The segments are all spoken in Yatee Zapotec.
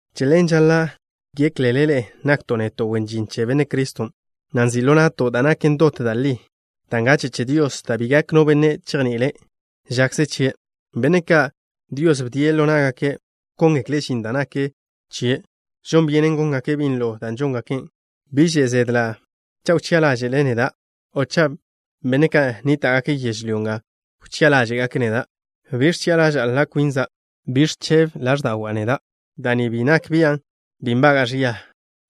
Che ḻen, žaḻa' géklele ḻe'e nakto' neto' wen žin che Benne' Criston', na' nzi' ḻo na'to' da' naken dot da' li, da' ngache' che Dios, da' bi gak no benne' chejni'ile' žakze chie'. Benne' ka', Dios bdie' ḻo ná'gake' wkóngekle' žin da' nak chie', žon byenen góngake' binlo da' žóngake'. Bi že' zedla' cha' wchi'a ḻáže'le neda', o cha' benne' ka' nníta'gake' yežlyó nga wchi'a ḻáže'gake' neda'. Bi ẕchi'a ḻaža'a kwina'. Bi ẕchebe ḻáẕda'wa' neda'. Da' ni bi nak bian' bi nbaga'a ẕia.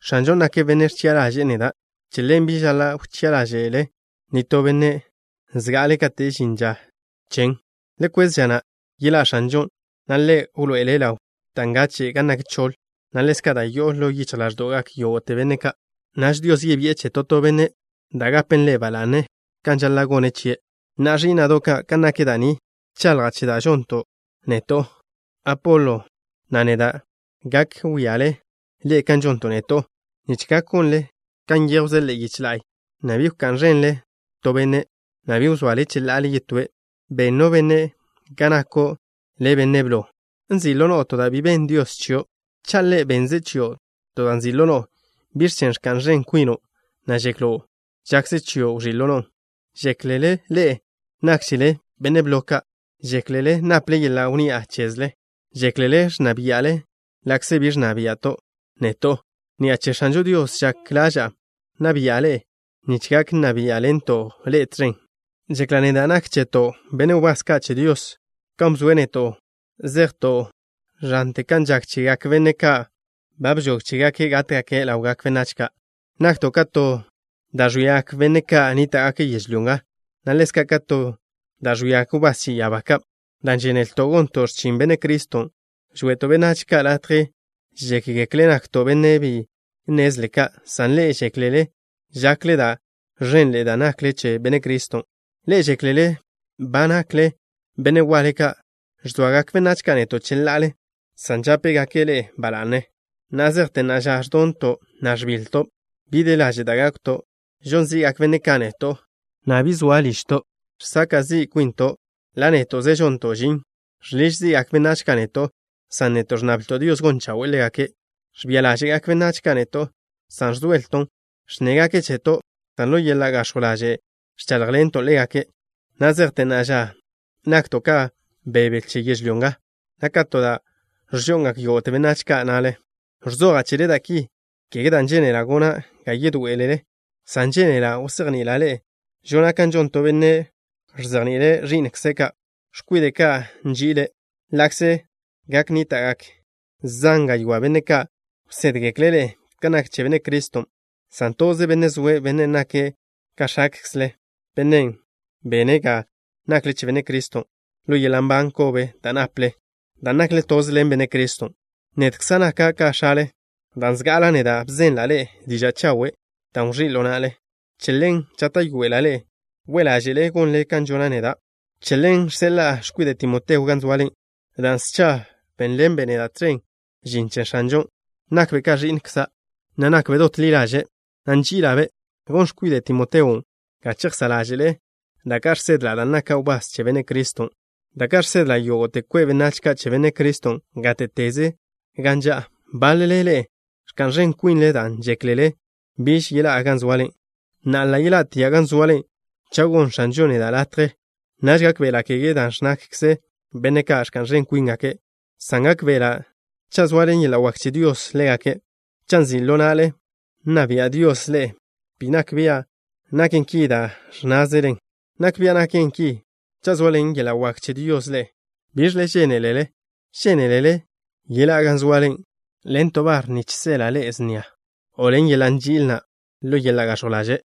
X̱anžon' nake' Benne' ẕchi'a ḻaže'e neda'. Che ḻen, bi žaḻa' wchi'a ḻáže'le nitó benne' zga'ale kate' žin ža chen. Le kwez ža na' yeḻá' X̱anžon', na' Ḻe' wḻoe'ele' ḻaw dan' ngache' gan nak choḻ, na' ḻezka' da' yo'o ḻo yichj ḻáẕdo'gak yógo'te benne' ka'. Naž Dios yebi'e che to to benne' da' gapen ḻe' ba la'ne kan žaḻa' gone' chie'. Na'a, ẕí'na'do' ka', kan nak da' ni, bchaḻja' che da' žonto' neto', Apolo, na' neda'. Gak wíale ḻe'e kan žonto' neto' nich gak gonle kan nyéjwze ḻe'e yiche la'y, na' bi wká'n ẕenle to benne', na' bi wzoale cheḻa'ale yetóe'. ¿Ben no benne' ga nako' le' benne' blo? ¿Nzi' ḻo no'o to da' bi benn Dios chio'? Cha' Ḻe' bennze' chio' dan' nzi' ḻo no'o, ¿biẕ chen' ẕka'n ẕen kwino', na' žeklo' žakze chio' wẕí' ḻo no'on? ¿Žéklele ḻe'e nákžele benne' blo ka'? ¿Žéklele naple yeḻa' wnni'a chezle? ¿Žéklele ẕnna bia'le, ḻa'kze bi ẕnna bia'to' neto'? Ni'a che X̱anžo Dios žak ḻaža'a nna bia'le ḻe'e nich gak nna biá'ḻento' ḻe'e tẕen. Žekla' neda' nak cheto', benne' wbás ka' che Dios, kan bzoe' neto' zejto' ẕante kan žak chegak benne' ka' ba nžog chégake' gátgake' ḻawgak benách ka'. Nakto' ka to da' ẕwiagak benne' ka' nníta'gake' yežlyó nga, na' ḻezka' ka to da' ẕwiagak wbás che ya'abá ka'. Dan' žénelto' gonto' x̱chin Benne' Criston', žwe'to' benách ka' latje žékgekle' nakto' benne' bi nnezle ka', san ḻe'e žéklele žakle da' ẕenḻe'e dan' nakle che Benne' Criston'. Ḻe'e žéklele ba nakle benne' waḻe ka', san žékgekle benách neto' bi nakto' benne' waḻe ka'. Ẕzoagak benách ka' neto' cheḻa'ale, san žápegake' ḻe'e ba la'ne. Na' zejte na'a ža, ẕdonto', na' ẕbiḻto'. Bi de laže' da' gákwton'. Žon zi'gak benne' ka' neto', na' bi zoa ližto'. Žsaka' zi' kwinto', ḻa' néto'ze žonto' žin. Žḻiž zi'gak benách ka' neto', san neto' ẕnnablto' Dios gon chawe'e ḻégake'. Ẕbia ḻáže'gak benách ka' neto', san ẕzoelton'. Ẕnnégake' cheto', san ḻo yeḻa' gax̱jw ḻaže' ẕcháḻjḻento' ḻégake'. Na' zejte na'a ža nakto' ka bebe che yežlyó nga, na' ka to da' ẕžo'ngak yógo'te benách ka' na'le. Ẕzoja' chele da' ki, kege dan' žénela' gona' ga yedoé'elele, san žénela' wzejni'ila' ḻe'e, žona' kan žon to benne' ẕzejni'ile' ẕi'nkze' ka', x̱kwide' ka' nži'ile'. Ḻa'kze gak nníta'gak zan gaywá' benne' ka' wsédgekle' ḻe'e kan nak che Benne' Criston', san toze benne' zoe', benne' nake' ka x̱akzle, bennen' bene' ga nakle che Benne' Criston'. Ḻo yeḻa' nban kobe da' naple dan' nakle toze ḻen Benne' Criston', nedkza' naka' ka x̱ale dan' zga'ala' neda' bzenla' ḻe'e diža' chawe' da' wẕí' ḻo na'le. Che ḻen, žáta'yoela' ḻe'e we' ḻáže'le gonle kan žona' neda'. Che ḻen žseḻa'a x̱kwide' Timoteo gan zoale. Dan' scha bénḻenbe' neda' tẕen žin che X̱anžon' nakbe' ka ẕi'nkza', na' nakbe' dot ḻi ḻaže', na' nži'ila'-be'. Gon x̱kwide' Timoteon' ga chejsá' ḻáže'le da' ka' žsedla' dan' naka' wbás che Benne' Criston', da' ka' žsedla' yógo'te kwe' benách ka' che Benne' Criston' gáte'teze gan ža'a. Báḻele ḻe'e ẕka'n ẕen kwinle dan' žéklele biž yeḻá'a gan zoale. Na'a, ḻa' yeḻá'tia' gan zoale cha' gonn X̱anžon' neda' latje. Naž gákbe'ela', kege da' ẕnnágakze benne' ka' ẕka'n ẕen kwíngake', san gákbe'ela' cha' zoaḻen yeḻa' wak che Dios ḻégake'. Cha' nzi' ḻo na'le nna bia' Dios ḻe'e, bi nak bia' naken ki dan' ẕnnázelen. Nak bia' naken ki cha' zoaḻen yeḻa' wak che Dios ḻe'e. ¿Biẕle žénelele? ¿Žénelele yeḻá'a gan zoale ḻen to bar nich seḻa' snia ḻe'e, o ḻen yeḻa' nži'il, na' ḻo yeḻa' gax̱jw ḻaže'?